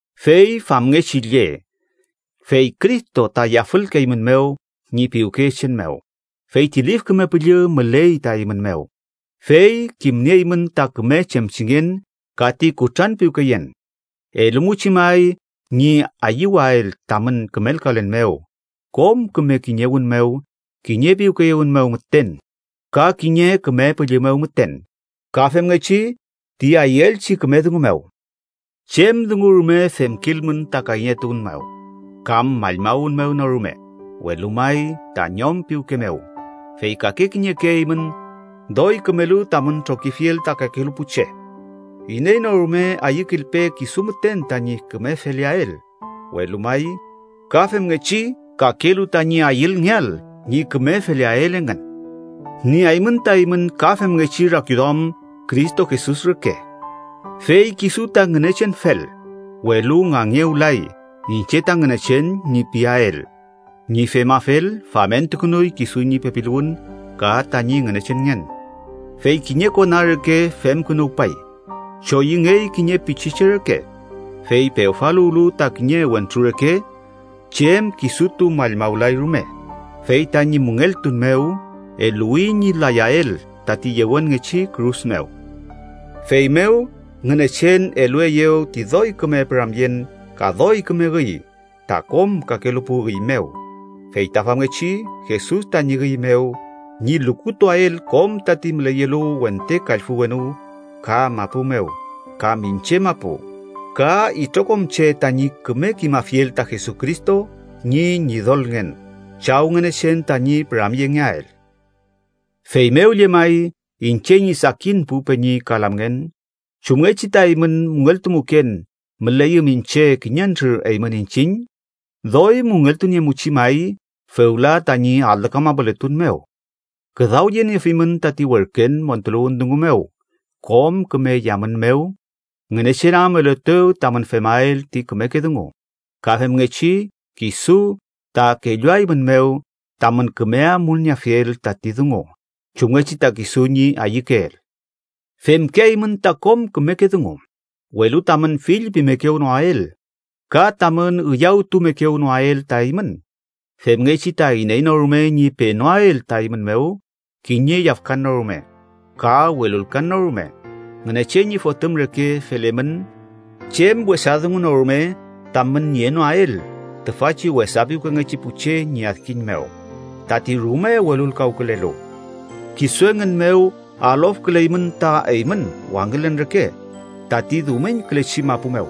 Fey famngechi lle, fey Cristo ta yafülkeeymünmew ñi piwkeyechen mew, feyti Lif Küme Püllü müley ta eymün mew, fey kimnieymün ta küme chemchingen ka ti kutranpiwkeyen, elumuchi may ñi ayüwael tamün kümelkalen mew kom küme kiñewün mew kiñe piwkeyewün mew müten, ka kiñe Küme Püllü mew müten, ka femngechi ti ayüelchi küme dungu mew. Chem dungu rume femkilmün ta kayñetuwün mew kam mallmawün mew no rume, welu may ta ñom piwke mew, fey kake kiñeke eymün doy kümelu tamün trokiafiel ta kakelu pu che. Iney no rume ayükilpe kisu müten tañi küme feleael, welu may ka femngechi kakelu tañi ayülngeael ñi küme feleael engün. Nieaymün ta eymün ka femngechi rakiduamün Cristo Jesus reke, fey kisu ta Ngünechenfel, welu ngangewlay “iñche ta Ngünechen” ñi piael. Ñi femafel, famentukünuy kisu ñi pepiluwün ka tañi Ngünechenngen. Fey kiñe kona reke femkünuwpay, choyüngey kiñe pichiche reke. Fey pewfaluwlu ta kiñe wentru reke, chem kisutu mallmawlay rume, fey tañi müngeltun mew eluwi ñi layael tati yewenngechi kürus mew. Feymew, Ngünechen elueyew ti doy küme püramyen ka doy küme üy ta kom kakelu pu üy mew, fey ta famngechi, Jesus tañi üy mew, ñi lukutuael kom tati müleyelu wente kallfü wenu, ka mapu mew, ka miñche mapu, ka itrokom che tañi küme kimafiel ta Jesucristo ñi Ñidolngen, Chaw Ngünechen tañi püramyengeael. Feymew llemay, iñche ñi sakin pu peñi ka lamngen, chumngechi ta eymün müngeltumuken müleyüm iñche kiñentrür eymün iñchiñ, doy müngeltuniemuchi may fewla tañi alü kamapuletun mew. Küdawyeniefimün tati werken montuluwün dungu mew kom küme yamün mew, Ngünechen am eluetew tamün femael ti kümeke dungu, ka femngechi kisu ta kelluaeymünmew tamün küme amulnieafiel tati dungu, chumngechi ta kisu ñi ayükeel. Femkeaymün ta kom kümeke dungu, welu tamün fillpimekewnoael ka tamün üyawtumekewnoael ta eymün, femngechi ta iney no rume ñi penoael ta eymün mew kiñe yafkan no rume ka welulkan no rume. Ngünechen ñi Fotüm reke felemün chem wesa dungu no rume tamün nienoael tüfachi wesa piwkengechi pu che ñi adkiñ mew, tati rume welulkawkülelu. Kisu engün mew alofküleymün ta eymün wangülen reke tati dumiñkülechi mapu mew.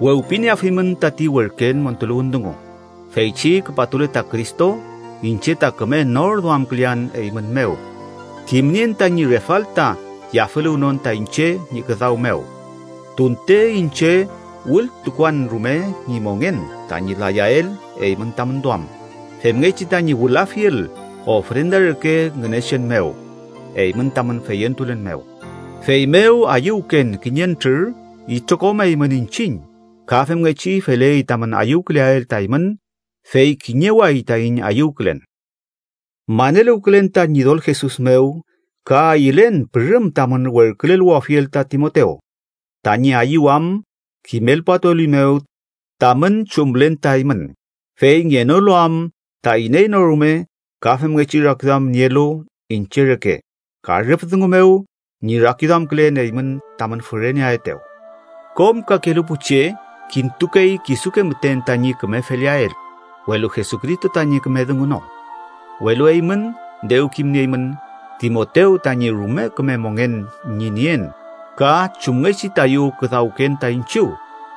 Wewpinieafimün tati werken montuluwün dungu. Feychi küpatule ta Cristo, iñche ta küme norduamkülean eymün mew, kimnien tañi refalta yafüluwnon ta iñche ñi küdaw mew. Tunte iñche wültukuan rume ñi mongen tañi layael eymün tamün duam, femngechi tañi wülafiel ofrenda reke Ngünechen mew eymün tamün feyentulen mew, feymew ayüwken kiñentrür itrokom eymün iñchiñ. Ka femngechi feley tamün ayüwküleael ta eymün, fey kiñeway taiñ ayüwkülen. Maneluwkülen ta Ñidol Jesus mew, ka ayülen pürüm tamün werküleluwafiel ta Timotew, tañi ayüwam kimelpatuelimew tamün chumlen ta eymün. Fey ngenolu am ta iney no rume ka femngechi rakiduam nielu iñche reke ka rüf dungu mew ñi rakiduamkülen eymün tamün füreneaetew. Kom kakelu pu che kintukey kisuke müten tañi küme feleael, welu Jesucristo tañi küme dungu no. Welu eymün dew kimnieymün Timotew tañi rume küme mongen ñi nien ka chumngechi tayu küdawken ta iñchiw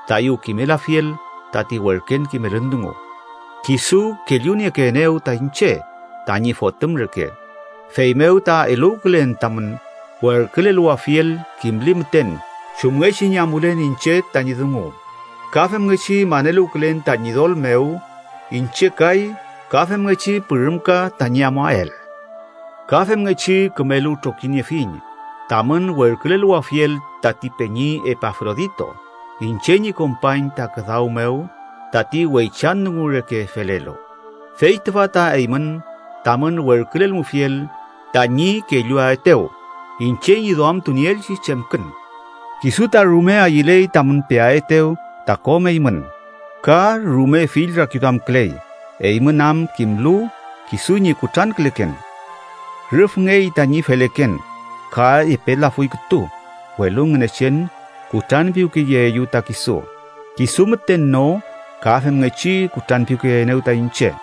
tayu kimelafiel tati werken kimelün dungu, kisu kelluniekeenew ta iñche, tañi fotüm reke. Feymew ta eluwkülen tamün werküleluwafiel kimli müten chumngechi ñi amulen iñche tañi dungu. Ka femngechi maneluwkülen ta Ñidol mew iñche kay ka femngechi pürümka tañi amuael. Ka femngechi kümelu trokiniefiñ tamün werküleluwafiel tati peñi Epafrodito, iñche ñi kompañ ta küdaw mew tati weychan dungu reke felelu, fey tüfa ta eymün tamün werkülelmufiel tañi kelluaetew iñche ñi duamtunieelchi chemkün. Kisu ta rume ayüley tamün peaetew ta kom eymün, ka rume fill rakiduamküley eymün am kimlu kisu ñi kutranküleken. Rüfngey tañi feleken, ka epe lafuy kütu, welu Ngünechen kutranpiwkeyeeyew ta kisu, kisu müten no ka femngechi kutranpiwkeyeenew ta iñche,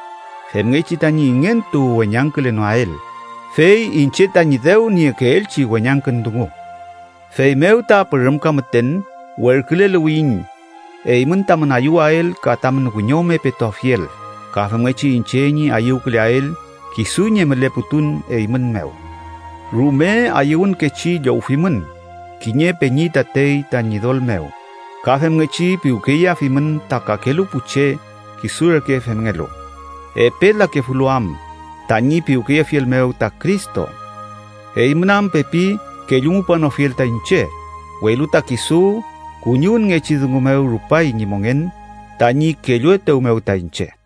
femngechi tañi ingentu weñangkülenoael, fey iñche tañi dew niekeelchi weñangkün dungu. Feymew ta pürümka müten werküleluwiyiñ, eymün tamün ayüwael ka tamün wiñome petuafiel ka femngechi iñche ñi ayüwküleael kisu ñi müleputun eymün mew. Rume ayüwünkechi llowfimün, kiñe peñi tatey ta Ñidol mew, ka femngechi piwkeyeafimün ta kakelu pu che kisu reke femngelu, epe lakefulu am tañi piwkeyefiel mew ta Cristo. Eymün am pepi kellumupanofiel ta iñche, welu ta kisu kuñiwünngechi dungu mew rupay ñi mongen tañi kelluetew mew ta iñche.